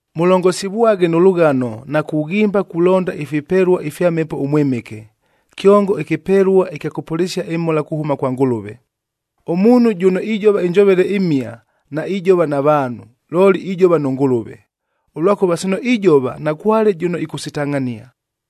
Mʉlongosivwaghe nʉ lʉghano na kughimba kulonda ifipelua ifya Mhepo ʉMwɨmɨke, kyongo ɨkɨpelua ɨkya kʉpʉlɨsia ɨmhola kuhʉma kwa Ngʉlʉve. Ʉmuunhu jʉno ijova ɨnjovele ɨmhia, naijova na vaanhu, looli ijova nʉ Ngʉlʉve, ʉlwakʉva sino ijova nakwale jʉno ɨkʉsitangʼhania.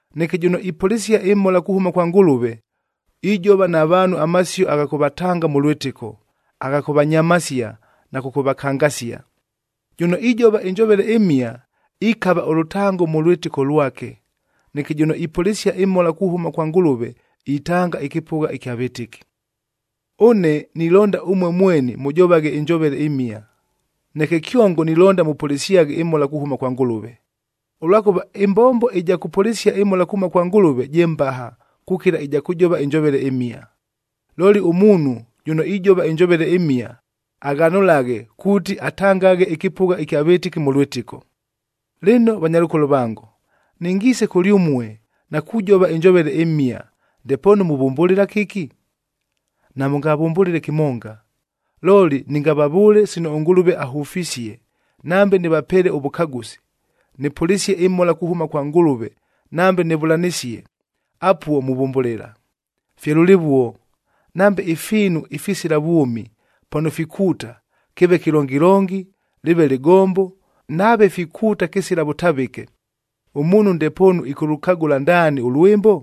Neke jʉno ipʉlɨsia ɨmhola kuhʉma kwa Ngʉlʉve, ijova na vaanhu amasio agha kʉvatanga mʉ lwɨtɨko, agha kʉvanyamasia na kʉkʉvakangasia. Jʉno ijova ɨnjovele ɨmhia, ikava ʉlʉtango mʉ lwɨtɨko lwake, neke jʉno ipʉlɨsia ɨmhola kuhʉma kwa Ngʉlʉve itanga ɨkɨpʉgha ɨkya vɨtɨki. Ʉne nilonda ʉmue mweni mʉjovaghe ɨnjovele ɨmhia, neke kyongo nilonda mʉpʉlɨsyaghe ɨmhola kuhʉma kwa Ngʉlʉve. Ʉlwakʉva ɨmbombo ɨja kʉpʉlɨsia ɨmhola kuhʉma kwa Ngʉlʉve je mbaha kukila ɨja kʉjova ɨnjovele ɨmhia. Looli ʉmuunhu, jʉno ijova ɨnjovele ɨmhia, aghanʉlaghe kuuti atangaghe ɨkɨpʉgha ɨkya vɨtɨki mʉ lwɨtɨko. Lɨno vanyalʉkolo vango, nɨngiise kʉlyʉmue na kujova ɨnjovele ɨmhia, ndepoonu muvʉmbʉlɨla kɨki? Namʉngavʉmbʉlɨle kɨmonga, looli nɨngavavʉʉle sino ʉNgʉlʉve ahʉfisie, nambe nɨvapeele ʉvʉkagʉsi, nɨpʉlɨsie ɨmhola kuhʉma kwa Ngʉlʉve nambe nɨvʉlanɨsie, apuo muvʉmbʉlɨla. Fye lʉlɨvuo, nambe ifiinu ifisila vwʉmi, pano fikuuta, kɨɨve kɨlongilongi, lɨɨve lɨgombo, nave fikuuta kɨsila vʉtavɨke, ʉmuunhu ndepoonu ɨkʉlʉkagʉla ndaani ʉlwɨmbo?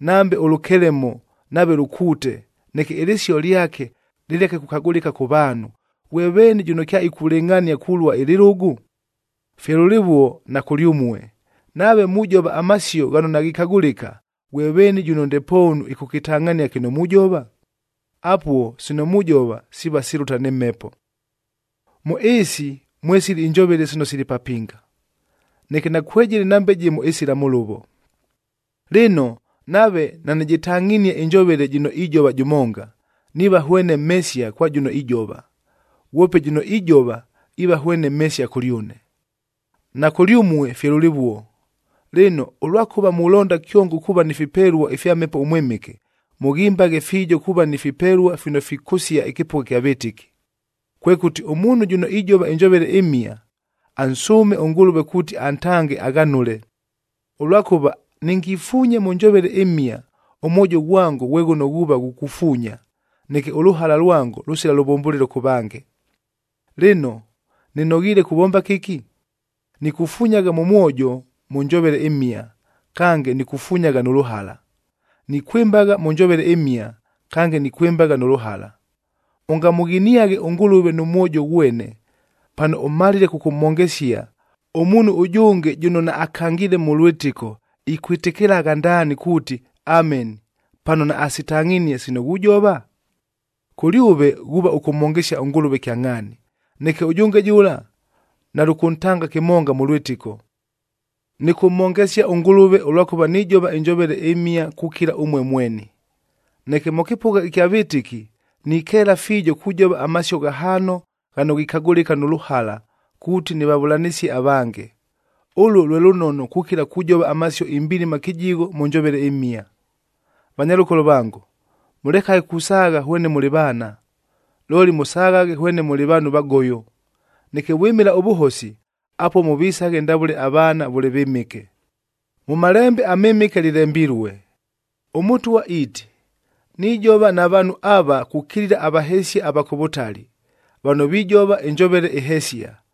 Nambe ʉlʉkelemo nave lʉkuute, neke ɨlɨsio lyake lɨleke kukagʉlɨka kʉ vaanhu, ghwe veeni jʉno kyaikulɨngʼhania kulua ɨlɨlʉgʉ? Fye lʉlɨvuo na kʉlyʉmue, nave mujova amasio ghano naghikagʉlɨka, ghwe veeni jʉno ndepoonu ɨkʉkɨtangʼhania kɨno mujova? Apuo sino mujova siiva silʉta nɨ mhepo. Mʉ ɨɨsi mwesili ɨnjovele sino sili papinga, neke nakwejɨlɨ nambe jɨmo ɨsila mʉlʉvo. Lɨno, nave nanɨjɨtangʼhinie ɨnjovele jɨno ijova jʉmonga, niiva hwene mhesia kwa jʉno ijova, ghwope jʉno ijova iiva hwene mhesia kʉlyʉne. Na kʉlyʉmue fye lʉlɨvuo. Lɨno, ʉlwakʉva mulonda kyongo kuuva ni fipelua ifya Mhepo ʉMwɨmɨke, mʉghimbaghe fiijo kuuva ni fipelua fino fikʉsia ɨkɨpʉgha ɨkya vɨtɨki. Kwekʉti, ʉmuunhu jʉno ijova ɨnjovele ɨmhia, ansʉʉme ʉNgʉlʉve kuuti antange aghanʉle. Ʉlwakʉva nɨngifuunye mʉ njovele ɨmhia, ʉmwojo ghwango ghwe ghʉno ghuuva ghukufuunya, neke ʉlʉhala lwango lʉsila lʉvʉmbʉlɨlo kʉ vange. Lɨno, nɨnoghiile kuvomba kɨki? Nikufunyagha mʉ mwojo mʉ njovele ɨmhia, kange nikufunyagha nʉ lʉhala; nikwɨmbagha mʉ njovele ɨmhia, kange nikwɨmbagha nʉ lʉhala. Ʉngamʉghiniaghe ʉNgʉlʉve nʉ mwojo ghwene, pano ʉmalile kʉkʉmhongesia, ʉmuunhu ʉjʉnge jʉno naakangiile mʉ lwɨtɨko ikwɨtɨkɨlagha ndaani kuuti, “Ameni,” pano naasitangʼhinie sino ghujova? Kʉlyʉve ghuuva ʉkʉmhongesia ʉNgʉlʉve kyangʼhaani, neke ʉjʉnge jʉla nalʉkʉntanga kɨmonga mʉ lwɨtɨko. Nɨkʉmhongesia ʉNgʉlʉve ʉlwakʉva nijova ɨnjovele ɨmhia kukila ʉmue mweni, neke mʉ kɨpʉgha ɨkya vɨtɨki nikeela fiijo kujova amasio ghahaano ghano ghikagʉlɨka nʉ lʉhala kuuti nɨvavʉlanɨsie avange. Ʉluo lwe lʉnono kukila kujova amasio imbilima kɨjigho mʉ njovele ɨmhia. Vanyalʉkolo vango, mʉlekaghe kusaagha hwene mʉlɨ vaana, looli mʉsaghaghe hwene mʉlɨ vaanhu vagoyo. Neke vwɨmɨla ʉvʉhosi, apuo mʉvisaghe ndavʉle avaana vʉle vɨmɨke. Mʉ Malembe aMɨmɨke lɨlembilue, “ɄMʉtwa iiti, ‘Nijova na vaanhu ava kukilila avahesia ava kʉ vʉtali, vano vijova ɨnjovele ɨhesia,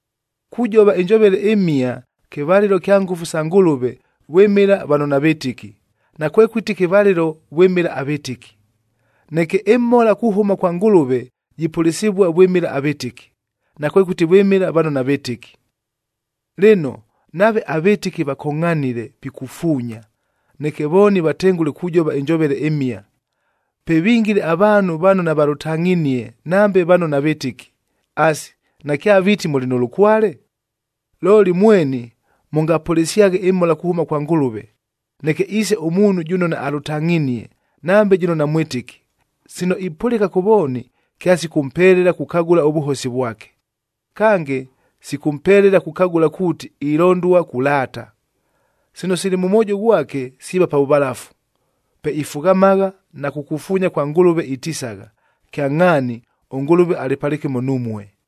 Kujova ɨnjovele ɨmhia kɨvalɨlo kya ngʉfu sa Ngʉlʉve vwɨmɨla vano navɨtɨki, nakwekʉti kɨvalɨlo vwɨmɨla avɨtɨki. Neke ɨmhola kuhʉma kwa Ngʉlʉve jipʉlɨsɨvua vwɨmɨla avɨtɨki, nakwekʉti vwɨmɨla vano navɨtɨki. Lɨno, nave avɨtɨki vakongʼhanile pikufuunya, neke vooni vatengʉle kujova ɨnjovele ɨmhia, pe vingile avaanhu vano navalʉtangʼhinie, nambe vano navɨtɨki, asi, nakyaviiti mʉlɨ nʉ lʉkwale? Looli mweni mʉngapʉlɨsyaghe ɨmhola kuhʉma kwa Ngʉlʉve, neke iise ʉmuunhu jʉno naalʉtangʼhinie, nambe jʉno namwɨtɨki, sino ipʉlɨka kʉ vooni kyasikʉmpelela kukagʉla ʉvʉhosi vwake. Kange, sikʉmpelela kukagʉla kuuti ilondua kulaata. Sino sili mʉ mwojo ghwake, siiva pa vʉvalafu, pe ifughamagha na kukufuunya kwa Ngʉlʉve itisagha, “Kyangʼhaani ʉNgʉlʉve alɨ palɨkɨmo numue!”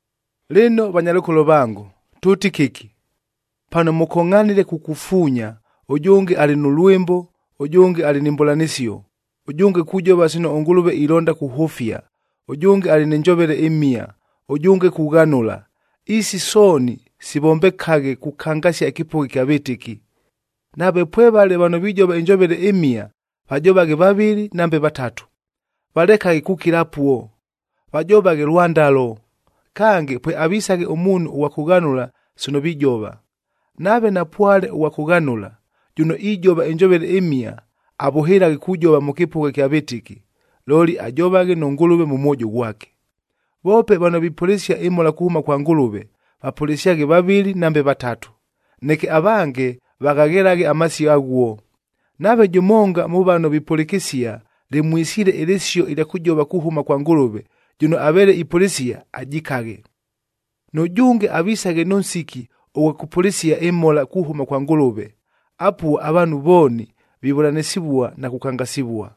Lɨno vanyalʉkolo vango, tʉʉti kɨki? Pano mʉkongʼhanile kukufuunya, ʉjʉnge alɨ nʉ lwɨmbo, ʉjʉnge alɨ ni mbʉlanɨsio, ʉjʉnge kujova sino ʉNgʉlʉve ilonda kuhʉfia, ʉjʉnge alɨ nɨ njovele ɨmhia, ʉjʉnge kughanʉla, isi sooni sivombekaghe kukangasia ɨkɨpʉgha ɨkya vɨtɨki. Nave pwevale vano vijova ɨnjovele ɨmhia, vajovaghe vavɨlɨ nambe vatatu, valekaghe kukila apuo, vajovaghe lwandalo, kange pweavisaghe ʉmuunhu ʉghwa kʉghanʉla sino vijova. Nave napwale ʉghwa kʉghanʉla, jʉno ijova ɨnjovele ɨmhia avʉhɨlaghe kujova mʉ kɨpʉgha ɨkya vɨtɨki, looli ajovaghe nʉ Ngʉlʉve mʉ mwojo ghwake. Voope vano vipʉlɨsia ɨmhola kuhʉma kwa Ngʉlʉve, vapʉlɨsyaghe vavɨlɨ nambe vatatu, neke avange vaghaghelaghe amasio aghuo. Nave jʉmonga mʉ vano vipʉlɨkɨsia lɨmwisiile ɨlɨsio ɨlya kʉjova kuhʉma kwa Ngʉlʉve, jʉno aveele ipʉlɨsia ajikaghe. Nʉjʉnge avisaghe nʉ nsiki ʉghwa kʉpʉlɨsia ɨmhola kuhʉma kwa Ngʉlʉve, apuo avaanhu vooni vivʉlanɨsɨvua na kukangasivua.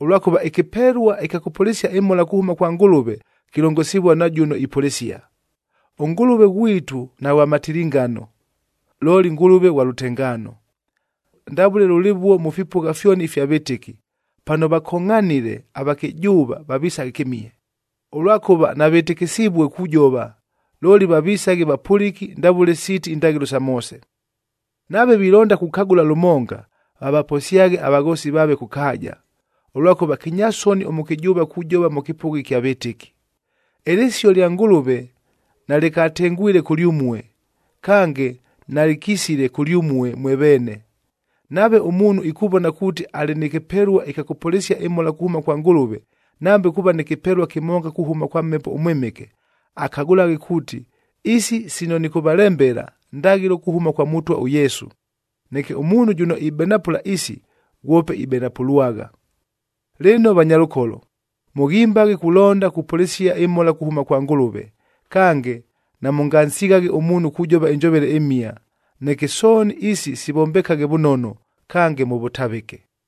Ʉlwakʉva ɨkɨpelua ɨkya kʉpʉlɨsia ɨmhola kuhʉma kwa Ngʉlʉve, kilongosivua nʉ jʉno ipʉlɨsia. ɄNgʉlʉve ghwitu naghwa matilingano, looli Ngʉlʉve ghwa lʉtengaano. Ndavʉle lʉlɨvuo mʉ fipʉgha fyoni ifya vɨtɨki, pano vakongʼhanile, avakɨjʉʉva vavisaghe kɨmihe, ʉlwakʉva navɨtɨkɨsivue kujova, looli vavisaghe vapʉlɨki ndavʉle siiti indaghɨlo sa Moose. Nave vilonda kukagʉla lʉmonga, vavaposyaghe avaghoosi vaave kʉ kaaja, ʉlwakʉva kɨnyasoni ʉmʉkɨjʉʉva kujova mʉ kɨpʉgha ɨkya vɨtɨki. Ɨlɨsio lya Ngʉlʉve nalɨkatengwile kʉlyʉmue, kange nalɨkisile kʉlyʉmue mwe veene! Nave ʉmuunhu ikuvona kuuti alɨ nɨ kɨpelua ɨkya kʉpʉlɨsia ɨmhola kuhʉma kwa Ngʉlʉve, nambe kuuva nɨ kɨpelua kɨmonga kuhʉma kwa Mhepo ʉMwɨmɨke, akagʉlaghe kuuti, isi sino nɨkʉvalembela, ndaghɨlo kuhʉma kwa Mʉtwa ʉYesu. Neke ʉmuunhu jʉno ibenapʉla isi, ghwope ibenapʉlwagha. Lɨno vanyalʉkolo, mʉghimbaghe kulonda kupʉlɨsia ɨmhola kuhʉma kwa Ngʉlʉve, kange namʉngansighaghe ʉmuunhu kujova ɨnjovele ɨmhia. Neke sooni isi sivombekaghe vʉnono, kange mʉ vʉtavɨke.